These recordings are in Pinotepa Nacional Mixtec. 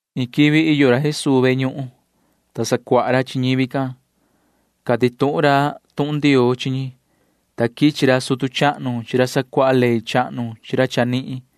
Iin quivi iyo ra Jesuu ve ñuhun, ta sacuaha ra chi ñivi can. Cati tuhun ra tuhun Ndioo chi ñi, ta quichi ra sutu chahnu chi ra sacuaha ley chahnu chi ra chanihin,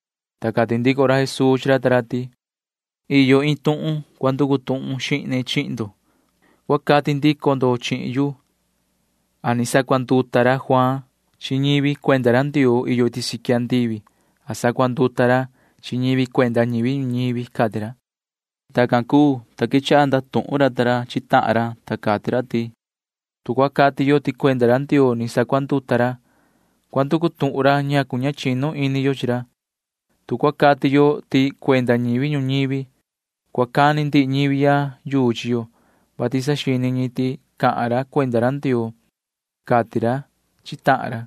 Ta cati ndico ra Jesuu chi ra ta ra ti: ―Iyo iin tuhun cua nducu tuhun xihne chihin ndo. Cua cati ndico ndo chihin yu a ni sacuanduta ra Juaan chi ñivi cuenda ra Ndioo iyo iti siqui andivi a sacuanduta ra chi ñi cuenda ñivi ñuñivi ―cati ra. Tacan cuu, ta quechaha ndatuhun ra ta ra chi tahan ra, ta cati ra ta ra ti: ―Tu cua cati yo ti cuenda ra Ndioo ni sacuanduta ra, cua nducu tuhun ra ñacu ña chinu ini yo chi ra. Tu cua cati yo ti cuenda ñivi ñuñivi, cua cani ndihi ñivi ya yuu chi yo, vati saxini ñi ti cahan ra cuenda ra Ndioo ―cati ra chi tahan ra.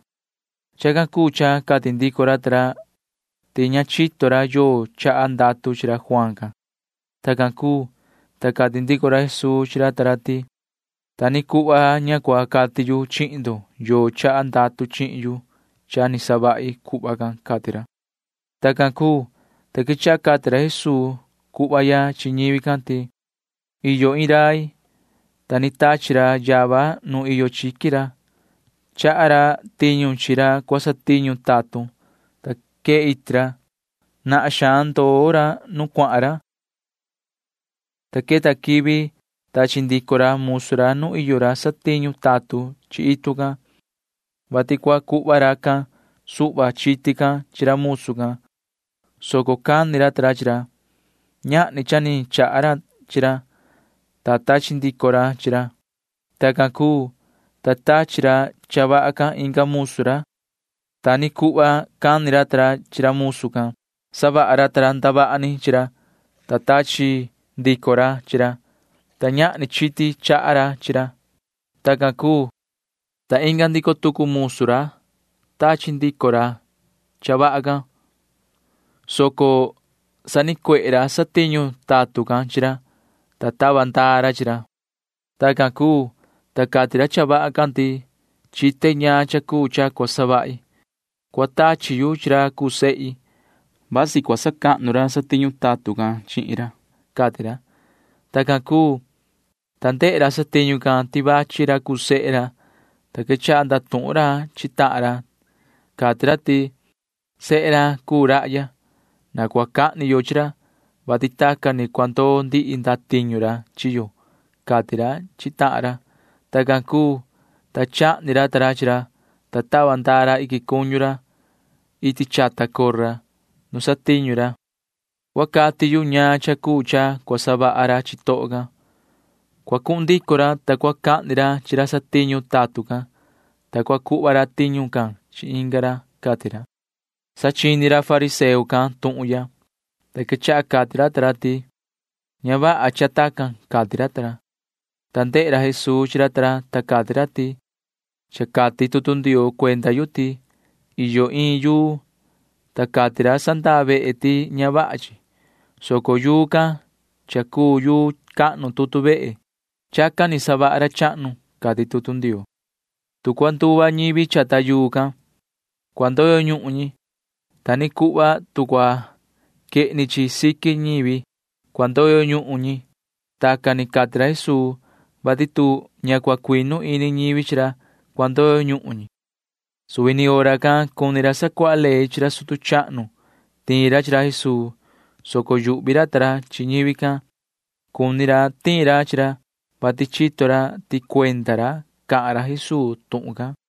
Chacan cuu cha cati ndico ra ta ra ti ña chito ra yoo chaha ndatu chi ra Juaan can. Tacan cuu, ta cati ndico ra Jesuu chi ra ta ra ti: ―Ta ni cuhva ña cua cati yu chihin ndo yoo chaha ndatu chihin yu cha ni savahi cuhva can ―cati ra. Tacan cuu, ta quechaha cati ra Jesuu cuhva ya chi ñivi can ti: ―Iyo iin rai, ta ni tachi ra yava nu iyo chiqui ra. Chaha ra tiñu chi ra cua satiñu tatun, ta quee iti ra. Nahan xaan ndoo ra nu cuahan ra, ta queta quivi tachi ndico ra musu ra nu iyo ra satiñu tatun chi itu can, vati cua cuhva racan suhva chiti can chi ra musu can, soco cani ra ta ra chi ra. Ñahni cha ni chaha ra chi ra, ta tachi ndico ra chi ra. Tacan cuu, ta tachi ra cha vaha can inga musu ra. Ta ni cuhva cani ra ta ra chi ra musu can. Savaha ra ta ra ndavaha ni chi ra, ta tachi ndico ra chi ra, ta ñahni chiti chaha ra chi ra. Tacan cuu, ta inga ndico tucu musu ra tachi ndico ra cha vaha can, soco sanicuehe ra satiñu tatun can chi ra, ta tava ndaa ra chi ra. ’Tacan cuu, ta cati ra cha vaha can ti: “Chite ñaan cha cuu cha cua savahi. Cua tachi yu chi ra cuu sehi. Vasi cua sacahnu ra satiñu tatun can chihin ra,” cati ra. Tacan cuu, ta ndehe ra satiñu can ti vachi ra cuu sehe ra, ta quechaha ndatuhun ra chi tahan ra. Cati ra ti: “Sehe ra cuu rahya. Na cua cahni yo chi ra, vati tacan ni cua ndoo ndihi ndatiñu ra chi yo,” cati ra chi tahan ra. Tacan cuu, ta chahni ra ta ra chi ra, ta tava ndaa ra iquin cuñu ra iti chata cora nu satiñu ra. ’Cua cati yu ñaan cha cuu cha cua savaha ra chitoho can. Cua cuhun ndico ra, ta cua cahni ra chi ra satiñu tatun can, ta cua cuhva ra tiñu can chi inga ra ―cati ra. Sa chini ra fariseo can tuhun ya, ta quechaha cati ra ta ra ti: ―Ña vaha cha tacan ―cati ra ta ra. Ta ndehe ra Jesuu chi ra ta ra, ta cati ra ti: ―Cha cati tutu Ndioo cuenda yu ti: Iyo iin yuu, ta cati ra sandaa vehe ti ña vaha chi, soco yuu can cha cuu yuu cahnu tutu vehe. Chacan ni savaha ra chahnu, cati tutu Ndioo. Tu cua nduva ñivi chata yuu can, cua ndoyo ñuhun ñi. Ta ni cuhva tu cua quehni chi siqui ñivi, cua ndoyo ñuhun ñi. [Tacan ni cati ra Jesuu, vati tu ña cua cuinu ini ñivi chi ra, cua ndoyo ñuhun ñi.] Suvi ni hora can cuni ra sacuaha ley chi ra sutu chahnu tiin ra chi ra Jesuu, soco yuhvi ra ta ra chi ñivi can. Cuni ra tiin ra chi ra, vati chito ra ti cuenda ra cahan ra Jesuu tuhun can.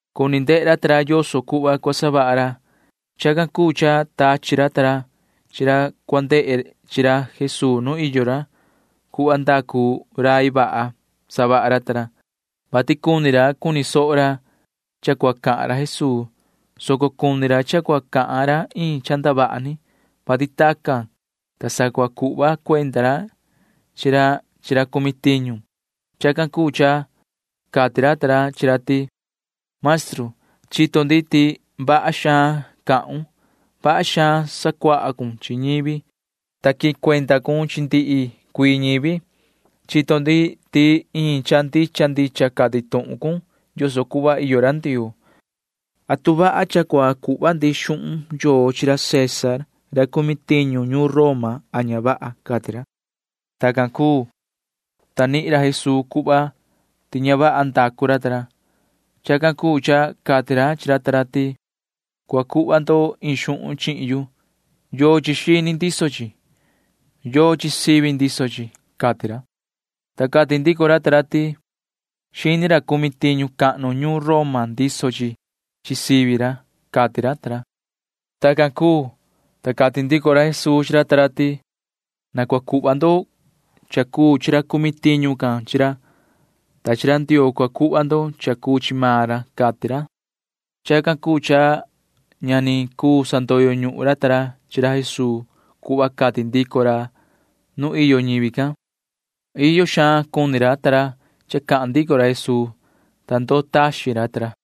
Cuni ndehe ra ta ra yoso cuhva cua savaha ra. Chacan cuu cha tachi ra ta ra chi ra cua ndehe chi ra Jesuu nu iyo ra. Cuhva ndacu rai vaha savaha ra ta ra, vati cuni ra cuni soho ra cha cua cahan ra Jesuu, soco cuni ra cha cua cahan ra iin cha ndavaha ni, vati tacan, ta sa cua cuhva cuenda ra chi ra chi ra cumi tiñu. Chacan cuu cha cati ra ta ra chi ra ti: ―Maestru, chito ndi ti vaha xaan cahun. Vaha xaan sacuahun chi ñivi, ta quihin cuenda cun chi ndihi cuii ñivi. Chito ndi ti iin cha ndicha ndicha cati tuhun cun yoso cuhva iyo ra Ndioo. ¿Atu vaha cha cua cuhva ndi xuhun yoo chi ra César ra cumi tiñu ñuun Roma a ña vaha? ―cati ra. Tacan cuu, ta nihin ra Jesuu cuhva ti ña vaha ndacu ra ta ra. Chacan cuu cha cati ra chi ra ta ra ti: ―Cua cuhva ndo iin xuhun chihin yu. ¿Yochi xini ndiso chi? ¿Yochi sivi ndiso chi? ―cati ra. Ta cati ndico ra ta ra ti: ―Xini ra cumi tiñu cahnu ñuun Roma ndiso chi chi sivi ra ―cati ra ta ra. Tacan cuu, ta cati ndico ra Jesuu chi ra ta ra ti: ―Na cua cuhva ndo cha cuu chi ra cumi tiñu can chi ra, ta chi ra Ndioo cua cuhva ndo cha cuu chi maan ra ―cati ra. Chacan cuu cha ña ni cuu sandoyo ñuhun ra ta ra chi ra Jesuu cuhva cati ndico ra nu iyo ñivi can. Iyo xaan cuni ra ta ra cha cahan ndico ra Jesuu, ta ndoo taxin ra ta ra.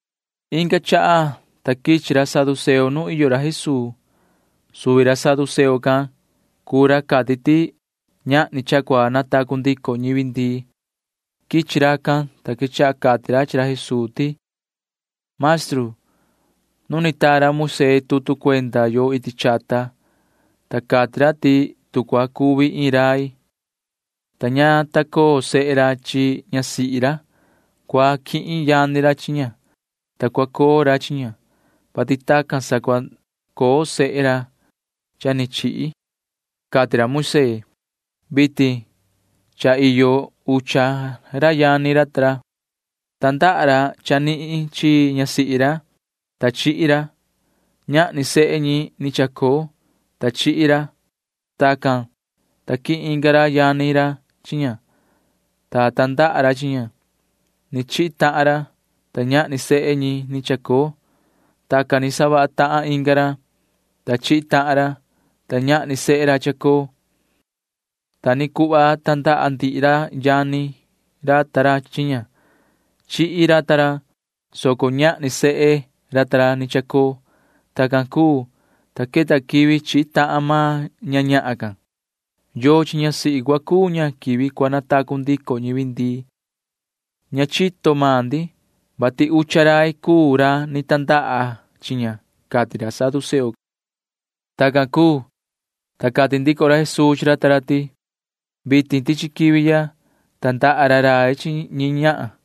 Inga chaha, ta quichi ra saduceo nu iyo ra Jesuu. Suvi ra saduceo can cuu ra cati ti ñahni cha cua natacu ndico ñivi ndii. Quichi racan, ta quechaha cati ra chi ra Jesuu ti: ―Maestru, nu ni taa ra Moisee tutu cuenda yo iti chata, ta cati ra ti tu cua cuvi iin rai, ta ña ta coo sehe ra chi ñasihi ra, cua quihin yani ra chi ña, ta cua coo ra chi ña, vati tacan sa cua coo sehe ra cha ni chihi, cati ra Moisee. Vitin cha iyo ucha ra yani ra ta ra. Tandaha ra chanihin chi ñasihi ra, ta chihi ra. Ñahni sehe ñi ni chacoo, ta chihi ra. Tacan, ta quihin inga ra yani ra chi ña, ta tandaha ra chi ña. Ni chihi tahan ra, ta ñahni sehe ñi ni chacoo. Tacan ni savaha tahan inga ra, ta chihi tahan ra, ta ñahni sehe ra chacoo. Ta ni cuhva tandaha ndihi ra yani ra ta ra chi ña. Chihi ra ta ra, soco ñahni sehe ra ta ra ni chacoo. Tacan cuu, ta queta quivi chihi tahan maan ña ñahan can. ¿Yochi ñasihi cua cuu ña quivi cua natacu ndico ñivi ndii? Ña chito maan ndi, vati ucha rai cuu ra ni tandaha chi ña ―cati ra saduceo can. Tacan cuu, ta cati ndico ra Jesuu chi ra ta ra ti: ―Vitin tichi quivi ya tandaha ra rai chi ñi ñahan,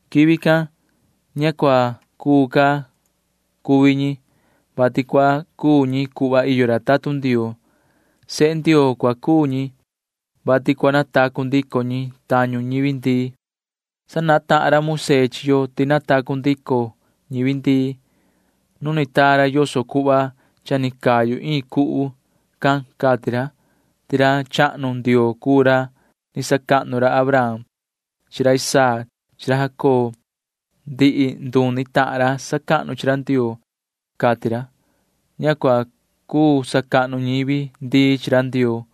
Quivi can ña cua cuu ca cuvi ñi, vati cua cuu ñi cuhva iyo ra tatun Ndioo. Sehe Ndioo cua cuu ñi, vati cua natacu ndico ñi tañu ñivi ndii. Sanahan tahan ra Moisee chi yo ti natacu ndico ñivi ndii. Nu ni taa ra yoso cuhva cha ni cayu iin cuhu can cati ra ti ra chahnu Ndioo cuu ra ni sacahnu ra Abraham chi ra Isaac chi ra Jacob. Ndihi nduni tahan ra sacahnu chi ra Ndioo, cati ra. Ña cuu sacahnu ñivi ndii chi ra Ndioo,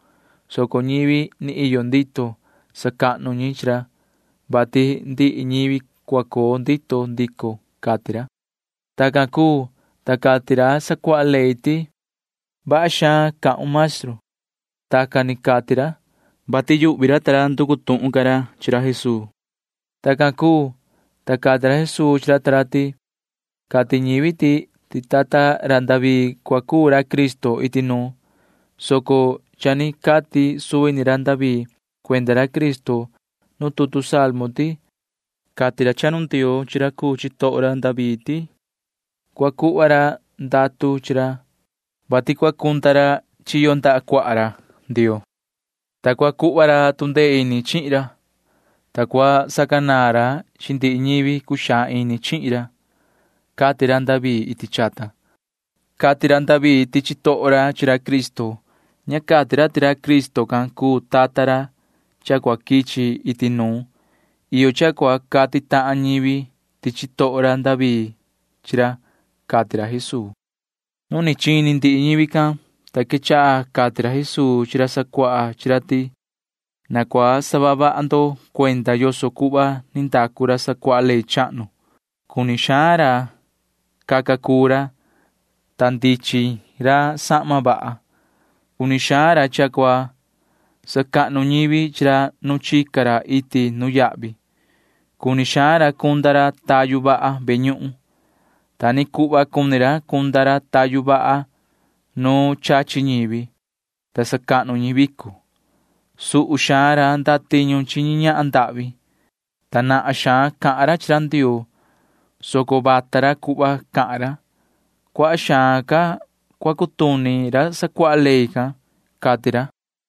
soco ñivi ni iyo ndito sacahnu chi ra, vati ndihi ñivi cua coo ndito ndico ñi ―cati ra. Tacan cuu, ta cati ndico ra sacuaha ley ti: ―Vaha xaan cahun, maestru. Tacan ni cati ra, vati yuhvi ra ta ra nducu tuhun ca ra chi ra Jesuu. Tacan cuu, ta cati ra Jesuu chi ra ta ra ti: ―Cati ñivi ti tata ra David cua cuu ra Cristo iti nuun, soco cha ni cati suvi ni ra David cuenda ra Cristo nu tutu Salmo ti: Cati ra chahnu Ndioo chi ra cuu chitoho ra David ti [cua cuhva ra ndatu chi ra], vati cua cunda ra chiyo ndaha cuaha ra Ndioo, [ta cua cuhva ra tu ndee ini chihin ra,] ta cua sacanaan ra chi ndihi ñivi cuxaan ini chihin ra, cati ra David iti chata. Cati ra David ti chitoho ra chi ra Cristo. Ña cati ra ti ra Cristo can cuu tata ra cha cua quichi iti nuun. Iyo cha cua cati tahan ñivi ti chitoho ra David chi ra ―cati ra Jesuu. Nu ni chini ndihi ñivi can, ta quechaha cati ra Jesuu chi ra sacuaha chi ra ti: ―Na cua saha vaha ndo cuenda yoso cuhva ni ndacu ra sacuaha ley chahnu. Cuni xaan ra caca cuu ra, ta ndichin ra sahma vaha. Cuni xaan ra cha cua sacahnu ñivi chi ra nu chica ra iti nuyahvi. Cuni xaan ra cunda ra tayu vaha ve ñuhun. Ta ni cuhva cuni ra cunda ra tayu vaha nu chachi ñivi, ta sacahnu ñi vico. Suhu xaan ra ndatiñu ñi ñahan ndahvi, ta nahan xaan cahan ra chi ra Ndioo, soco vata ra cuhva cahan ra. Cuaha xaan ca cua cutuni ra sacuaha ley can ―cati ra.